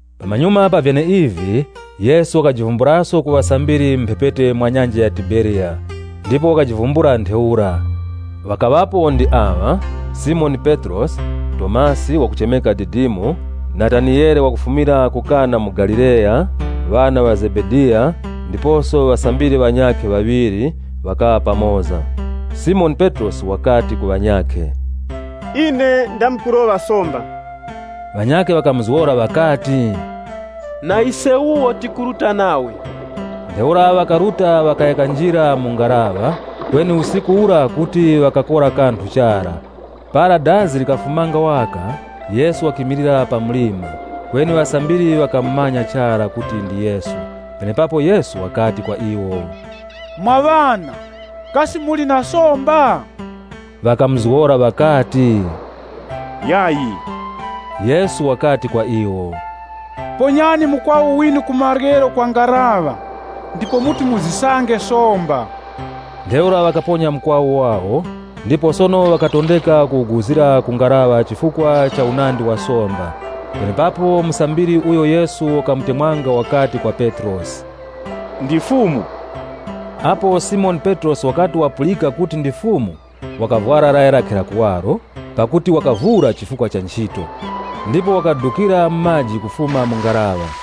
Pamanyuma pa vyeneivi, Yesu wakajivumbulaso ku ŵasambiri mu mphepete mwa nyanja ya Tiberiya. Ndipo wakajivumbula ntheura. Ŵakaŵapo ndi aŵa: Simoni Petrosi Tomasi (wakuchemeka Didimo), Nataniyele wakufumira ku Kana mu Galileya, ŵana ŵa Zebediya, ndiposo ŵasambiri ŵanyakhe ŵaŵiri, ŵakaŵa pamoza. Simoni Petrosi wakati ku ŵanyakhe, “Ine ndamkuroŵa somba.” Ŵanyakhe ŵakamuzgora ŵakati, “Na ise wuwo tikuruta nawe.” Ntheura ŵakaruta ŵakaya kanjira mu ngaraŵa. Kweni usiku ura kuti ŵakakora kanthu chara. Para dazi likafumanga waka, Yesu wakimilira pa mlima, kweni ŵasambiri ŵakamumanya chara kuti ndi Yesu. Penepapo Yesu wakati kwa iwo, “Mwa ŵana, kasi muli na somba?” Ŵakamuzgora ŵakati, “Yayi.” Yesu wakati kwa iwo, “Ponyani mukwawu winu ku maryero kwa ngaraŵa, ndipo muti muzisange somba.” Ntheura ŵakaponya mukwawu wawo, ndipo sono ŵakatondeka kuwuguzira mu ngaraŵa chifukwa cha unandi wa somba. Penepapo musambiri uyo Yesu wakamutemwanga wakati kwa Petrosi, “Ndi Fumu!” Apo Simoni Petrosi wakati wapulika kuti ndi Fumu, wakavwara laya lakhe la kuwaro, pakuti wakavura chifukwa cha nchito, ndipo wakadukira mu maji kufuma mu ngaraŵa.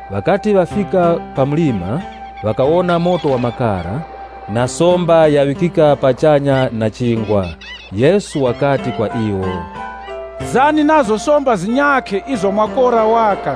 Ŵakati ŵafika pa mlima, ŵakawona moto wa makara, na somba yaŵikika pachanya, na chingwa. Yesu wakati kwa iwo, “Zani nazo somba zinyakhe izo mwakora waka.”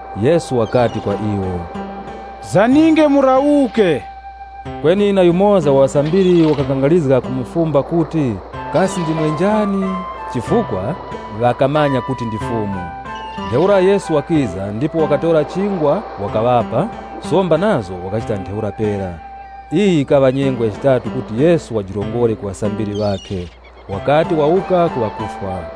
Yesu wakati kwa iwo, “Zaninge murawuke.” Kweni na yumoza wa ŵasambiri ŵakakangarizga kumufumba kuti, “Kasi ndimwe njani?” Chifukwa ŵakamanya kuti ndi Fumu. Ntheura Yesu wakiza ndipo wakatora chingwa wakaŵapa, somba nazo wakachita ntheura pera. Iyi yikaŵa nyengo ya chitatu kuti Yesu wajirongore ku ŵasambiri ŵakhe, wakati wawuka ku ŵakufwa.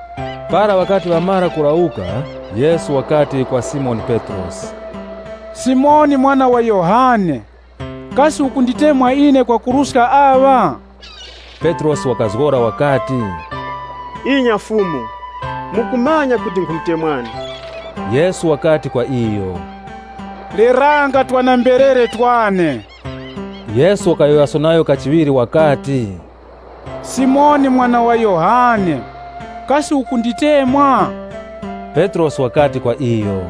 Para ŵakati ŵamara kurawuka, Yesu wakati kwa Simoni Petrosi, “Simoni mwana wa Yohane, kasi ukunditemwa ine kwakuruska aŵa?” Petrosi wakazgora wakati, “Inya Fumu. Mukumanya kuti nkhumutemwani.” Yesu wakati kwa iyo, “Leranga twana-mberere twane.” Yesu wakayowoyaso nayo kachiŵiri, “Simoni mwana wa Yohane, kasi ukunditemwa?” Petrosi wakati kwa iyo,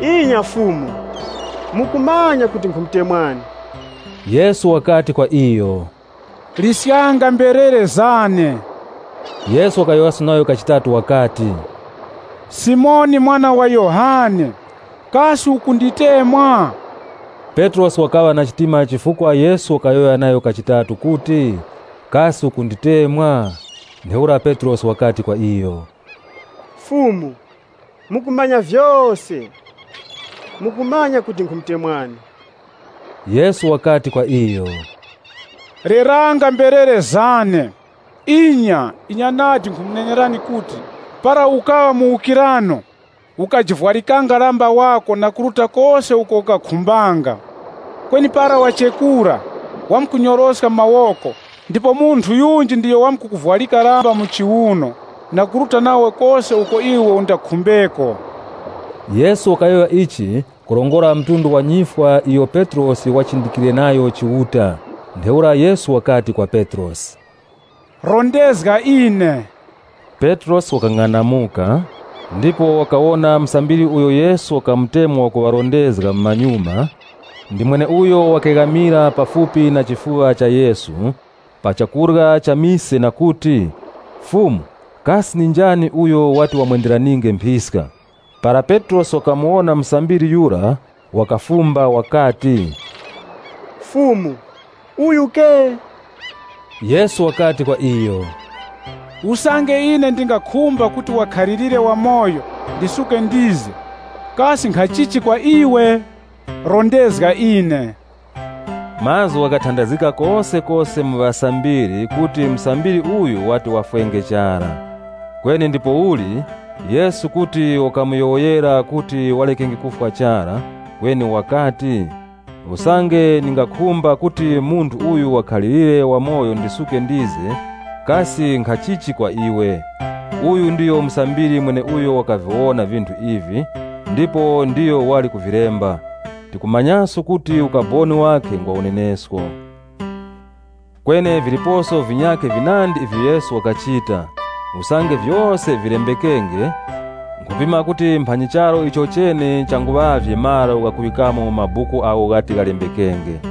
“Inya Fumu. Mukumanya kuti nkhumutemwani.” Yesu wakati kwa iyo, “Liskanga mberere zane.” Yesu wakayowoyaso nayo kachitatu wakati, “Simoni mwana wa Yohane, kasi ukunditemwa?” Petrosi wakaŵa na chitima chifukwa Yesu wakayowoya nayo kachitatu kuti, “Kasi ukunditemwa?” Ntheura Petrosi wakati kwa iyo, “Fumu, mukumanya vyose. Mukumanya kuti nkhumutemwani.” Yesu wakati kwa iyo, “Leranga mberere zane. Inya, inya nadi, nkhumunenerani kuti para ukaŵa muwukirano, ukajivwarikanga lamba wako na kuruta kose uko ukakhumbanga. Kweni para wachekura, wamkunyoroska mawoko ndipo munthu yunji ndiyo wamkukuvwarika lamba mu chiuno na kuruta nawe kose uko iwe undakhumbeko.” (Yesu wakayowoya ichi kurongora mtundu wa nyifwa iyo Petrosi wati wachindikire nayo Chiuta.) Ntheura Yesu wakati kwa Petrosi, “Rondezga ine.” Petrosi wakang'anamuka, ndipo wakawona musambiri uyo Yesu wakamutemwa wakuŵarondezga mumanyuma, ndi mweneuyo wakeghamira pafupi na chifuŵa cha Yesu, pa chakurya cha mise na kuti, “Fumu, kasi ndi njani uyo wati wamwenderaninge mphiska?” Para Petrosi wakamuwona musambiri yura, wakafumba wakati, “Fumu, kasi uyu nanga?” Yesu wakati kwa iyo, “Usange ine ndingakhumba kuti wakhalirire wamoyo ndisuke ndize kasi nkhachichi kwa iwe? Rondezga ine.” Mazgu ghakatandazgika kosekose mu ŵasambiri kuti musambiri uyu wati wafwe chara. Kweni ndipouli Yesu kuti wakamuyowoyera kuti wareke kufwa chara, kweni wakati, “Usange ndingakhumba kuti munthu uyu wakhalirire wamoyo ndisuke ndize, kasi nkhachichi kwa iwe?” Uyu ndiyo musambiri mweneuyo wakaviwona vinthu ivi ndipo ndiyo wali kuvilemba. Tikumanyaso kuti ukaboni wakhe ngwa unenesko. Kweni viliposo vinyakhe vinandi ivyo Yesu wakachita. Usange vyose vilembekenge, nkhupima kuti mphanyi charu ichochene changuŵavye malo ghakuŵikamo mabuku agho ghati ghalembekenge.